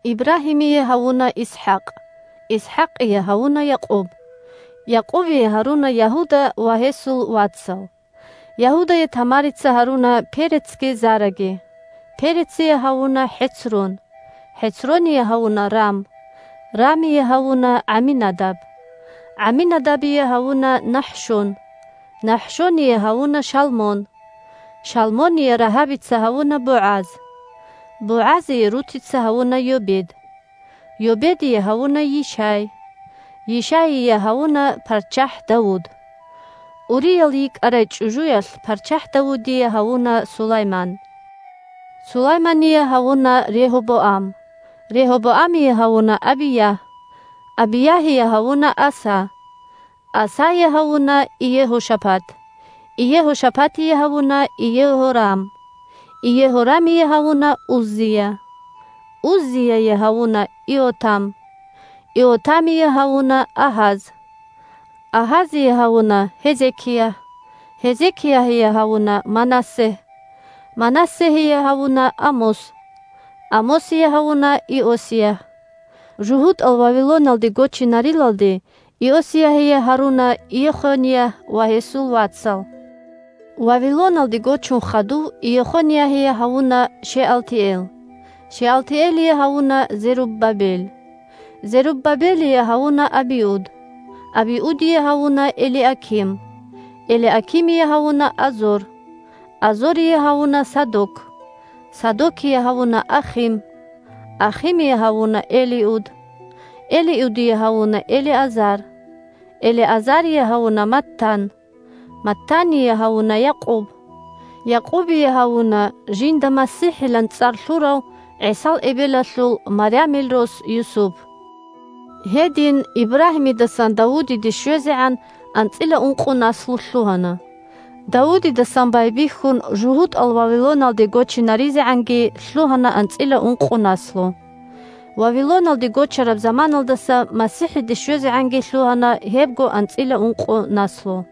Ибрагьимие гьавуна ИсхӀакъ, ИсхӀакъие гьавуна Якъуб, Якъубие гьаруна Ягьуда ва гьесул вацал. Ягьудае Тамарица гьаруна Перецги Зараги, Перецие гьавуна ХӀецрон, ХӀецроние гьавуна Рам, Рамие гьавуна ГӀаминадаб, ГӀаминадабие гьавуна НахӀшон, НахӀшоние гьавуна Шалмон, Шалмоние Рагьабица гьавуна БогӀаз, БогӀазие Рутица гьавуна Йобед, Йобедие гьавуна Йишай, Йишаие гьавуна парччахӀ Давуд. Уриял йикӀарай чӀужуялъ парччахӀ Давудие гьавуна Сулайман; Сулаймание гьавуна Регьобоам, Регьобоамие гьавуна Абиягь, Абиягьие гьавуна Аса; Асае гьавуна Иегьошапат, Иегьошапатие гьавуна Иегьорам, Иегьорамие гьавуна Уззия; Уззияе гьавуна Иотам, Иотамие гьавуна Агьаз, Агьазие гьавуна Гьезекиягь; Гьезекиягьие гьавуна Манассегь, Манассегьие гьавуна Амос, Амосие гьавуна Иосиягь; жугьутӀал Вавилоналде гочинарилалде Иосиягьие гьаруна Йехониягь ва гьесул вацал; Вавилоналде гочун хадув Йехониягьие гьавуна Шеалтиэл, Шеалтиэлие гьавуна Зеруббабел, Зеруббабелие гьавуна Абиуд, Абиудие гьавуна Элиаким; Элиакимие гьавуна Азор; Азорие гьавуна Садок, Садокие гьавуна Ахим, Ахимие гьавуна Элиуд; Элиудие гьавуна Элиазар, Элиазарие гьавуна Маттан, Маттание гьавуна Якъуб; Якъубие гьавуна жинда МасихӀилан цӀар лъурав ГӀисал эбелалъул – Марямил – рос Юсуп. Гьедин Ибрагьимидасан Давудиде щвезегӀан анцӀила ункъо наслу лъугьана; Давудидасан байбихьун жугьутӀал Вавилоналде гочинаризегӀанги лъугьана анцӀила ункъо наслу; Вавилоналде гочараб заманалдаса МасихӀиде щвезегӀанги лъугьана гьебго анцӀила ункъо наслу.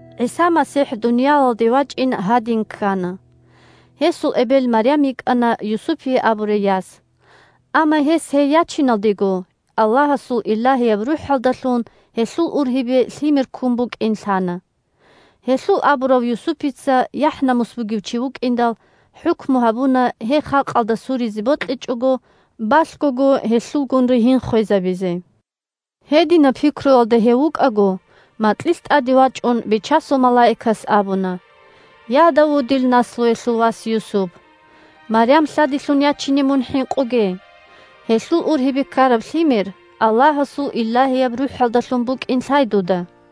ГӀиса МасихӀ дуниялалде вачӀин гьадин ккана: гьесул эбел Марям йикӀана Юсупие абурай яс; амма гьес гьей ячиналдего Аллагьасул Илагьияб РухӀалдалъун гьелъул ургьибе лъимер ккун букӀин лъана. Гьелъул абурав Юсупица, яхӀ-намус бугев чи вукӀиндал, хӀукму гьабуна гьей халкъалда суризе бокьичӀого, балъгого гьелъулгун ригьин хвезабизе. Гьединаб пикруялда гьев вукӀаго, макьилъ тӀаде вачӀун Бичасул малаикас абуна: – Я, Давудил наслуялъул вас Юсуп! Марям лъадилъун ячине мун хӀинкъуге. Гьелъул ургьибе ккараб лъимер Аллагьасул Илагьияб РухӀалдалъун букӀин лъай дуда.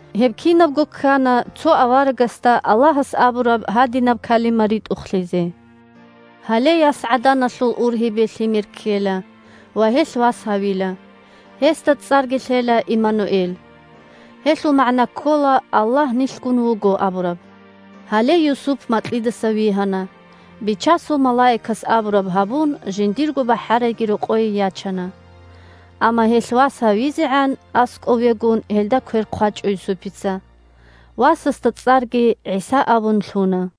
Гьеб кинабго ккана цо аварагасда Аллагьас абураб гьадинаб калима ритӀухълъизе: «Гьале ясгӀаданалъул ургьибе лъимер ккела ва гьелъ вас гьавила. Гьесда цӀарги лъела Имануэл». (Гьелъул магӀна ккола «Аллагь нилъгун вуго» абураб.) Гьале Юсуп макьидаса вигьана, Бичасул малаикас абураб гьабун, жиндирго бахӀарайги рокъое ячана. Амма гьелъ вас гьавизегӀан, аскӀов вегун, гьелда квер хъвачӀо Юсупица. Васасда цӀарги ГӀиса абун лъуна.